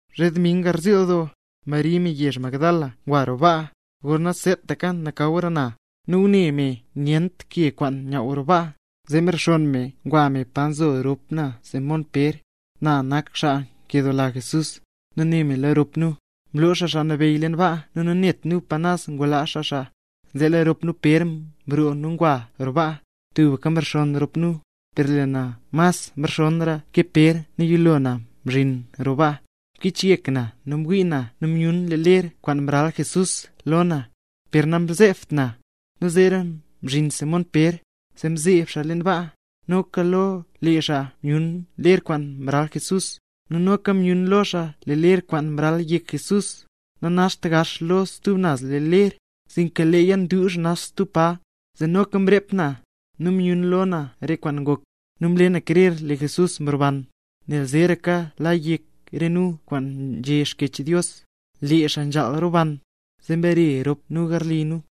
Zhe dming garziil doo, Mari me yezh Magdala ngwa roo baa, gorna seetaka nakawra na; nu ngune me nyent ke kwaan nyaww roo baa. Zee mrexonn me ngwa me pa nzo rop na Simón Pér, na nak xaa nkedoola Jesús, nu né me lo rop nu: —¡Mloo xaa Xaa Nabeyy leen baa nu nanet nu pa naz ngulaa xaa xaa! Zee lee rop na Pér mroo nu ngwa roo baa. Tubka mrexonn rop nu, per lee na mas nxonnra ke Pér nu yilo na mzhin na roo baa. Mkichyek na nu mwii na nu myun re ler kwaan mral Jesús lo na, per namzeebt na. Nu zeera mzhin Simón Pér, zee mzeeb xaa leen baa. Noka lo lee xaa myun ler kwaan mral Jesús; nu noka myun lo xaa lee ler kwaan mral yek Jesús, nanaxt gax lo stub naz ler, sinka leeya nduuzh nax stub pa. Zee noka mrep na, nu myun lo na re kwaan ngok, nu mle na krer lee Jesús mroban. Nel zeeraka la yek re nu kwaan nzhé Xkyech Dios, lee xaa nzhaal roban. Zee mbare rop nu garli nu.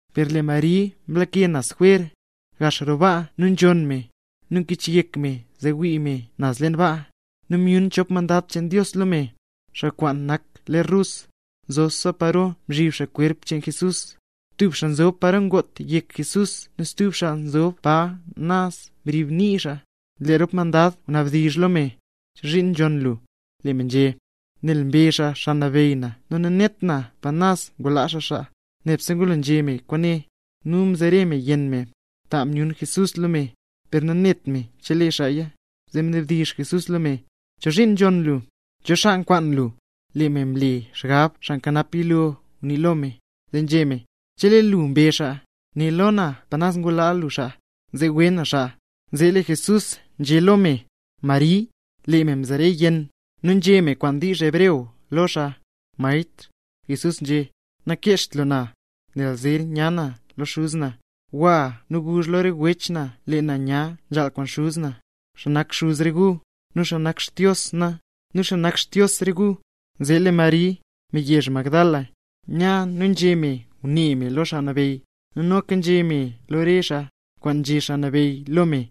Per lee Mari mlake naz jwer, gax roo baa nu nzhonn me, nu mkichyek me zee ngwii me naz leen baa, nu myun chop mandad cheen Dios lo me, xaa kwaan nak ler rus, nzobsa paro mzhib xaa kwerp cheen Jesús; tub xaa nzob paro ngot yek Jesús nu stub xaa nzob pa naz mrib nii xaa. Lee rop mandad ngunabdizh lo me: —¿Chozhiin nzhonn lu? Lee me nzhé: —Nel mbe xaa Xaa Nabeyy na nu nanet na pa naz ngulaa xaa xaa. Nebse ngulo nzhé me kwaane, nu mzere me yenn me, ta myun Jesús lo me, per nanet me chelee xaaya. Zee mnabdizh Jesús lo me: —¿Chozhiin nzhonn lu? ¿Cho xaa nkwaan lu? Lee me mle xgab xaa nkanap yilo ngunii lo me, zee nzhé me: —Chelee lee lu mbe xaa, né lo na pa naz ngulaa lu xaa, zee wee na xaa. Zee lee Jesús nzhé lo me: —¡Mari! Lee me mzere yenn, nu nzhé me kwaan wdizh hebreo lo xaa: —¡Maestr! Jesús nzhé: —Nakeezht lu na, nel zer nya na lo Xuz na. Gwa nu guzh lo re wech na lee na nya zhaal kwaan Xuz na, xaa nak Xuz re gu, nu xaa kwaan nak Xdios na, nu xaa nak Xdios re gu. Zee lee Mari, me yezh Magdala, nya nu nzhé me ngune me lo Xaa Nabeyy, nu noka nzhé me lo re xaa, kwaan nzhé Xaa Nabeyy lo me.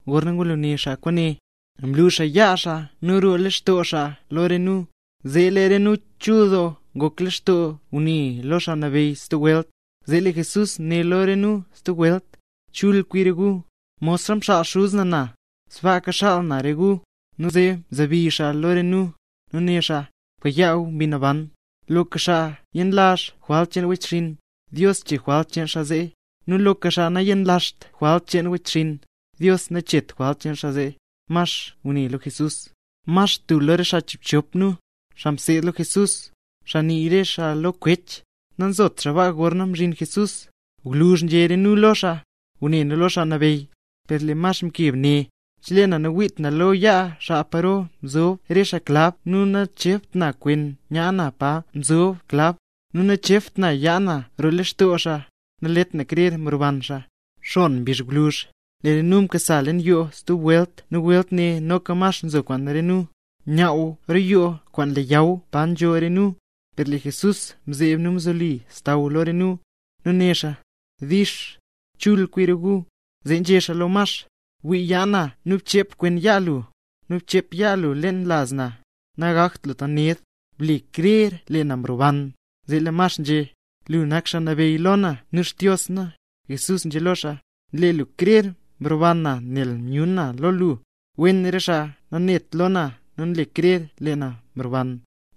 Gorna ngulo nguné xaa kwaane, mlu xaa yaa xaa nu roo lextoo xaa lo re nu. Zee lee re nu chul doo ngok lextoo ngune lo Xaa Nabeyy stub welt. Zee lee Jesús né lo re nu stub welt: —¡Chul kwi re gu! Modxa mxaal Xuz na na, sbaaka xaal na re gu. Nu mzebi xaa lo re nu, nu né xaa: —Bkayaa gu Mbi Naban. Loka xaa yenlazh jwalt cheen wechxinn, Dios chee jwalt cheen xaa zee; nu loka xaa nayenlazht jwalt cheen wechxinn, Dios nacheet jwalt cheen xaa zee. Max, tub lo re chiibchop nu, xaa mseed lo Jesús, xaa nii re xaa lo “Kwech”, nanzot baa gorna mzhin Jesús. Gwluzh nzhé re nu lo xaa: —Ngune nu lo Xaa Nabeyy. Per lee Max mkeb né: —Chelee nawiit na lo yaa xaa paro mzob re xaa klab nu nachebt na kwen yaa na pa mzob klab, nu nachebt na yaa na roo lextoo xaa, nalet na krer mroban xaa. Xon mbizh gwluzh, lee re nu mkasa leen yoo stub welt, nu welt ne noka Max nzo kwaan re nu. Nyaww roo yoo kwaan leyaw pa nzho re nu, per lee Jesús mzeeb nu mzoli xsaww lo re nu, nu né xaa: —Dix. Chul kwi re gu. Zee nzhé xaa lo Max: —Bwii yaa na nu bchep kwen yaa lu; nu bchep yaa lu leen laz na. Nagakt lu tant ned. ¡Ble krer lee na mroban! Zee lee Max nzhé: —¡Lu nak Xaa Nabeyy lo na nu Xdios na! Jesús nzhé lo xaa: —Nle lu krer mroban na nel myun na lo lu. ¡Wen re xaa kwaan nanet lo na nu nle xaa krer lee na mroban!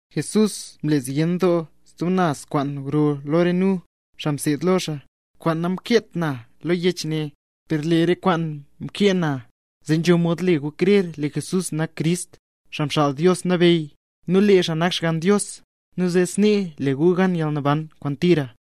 Jesús mle zyen doo stub naz kwaan gro lo re nu, xaa mseed lo xaa, kwaan namkeet na lo yech ne. Per lee re kwaane mkee na, zee nzho mod le gu krer lee Jesús nak Crist, Xaa Mxaal Dios Nabeyy, nu lee xaa nak Xgann Dios, nu zee snee le gu gan yalnaban kwaan tira.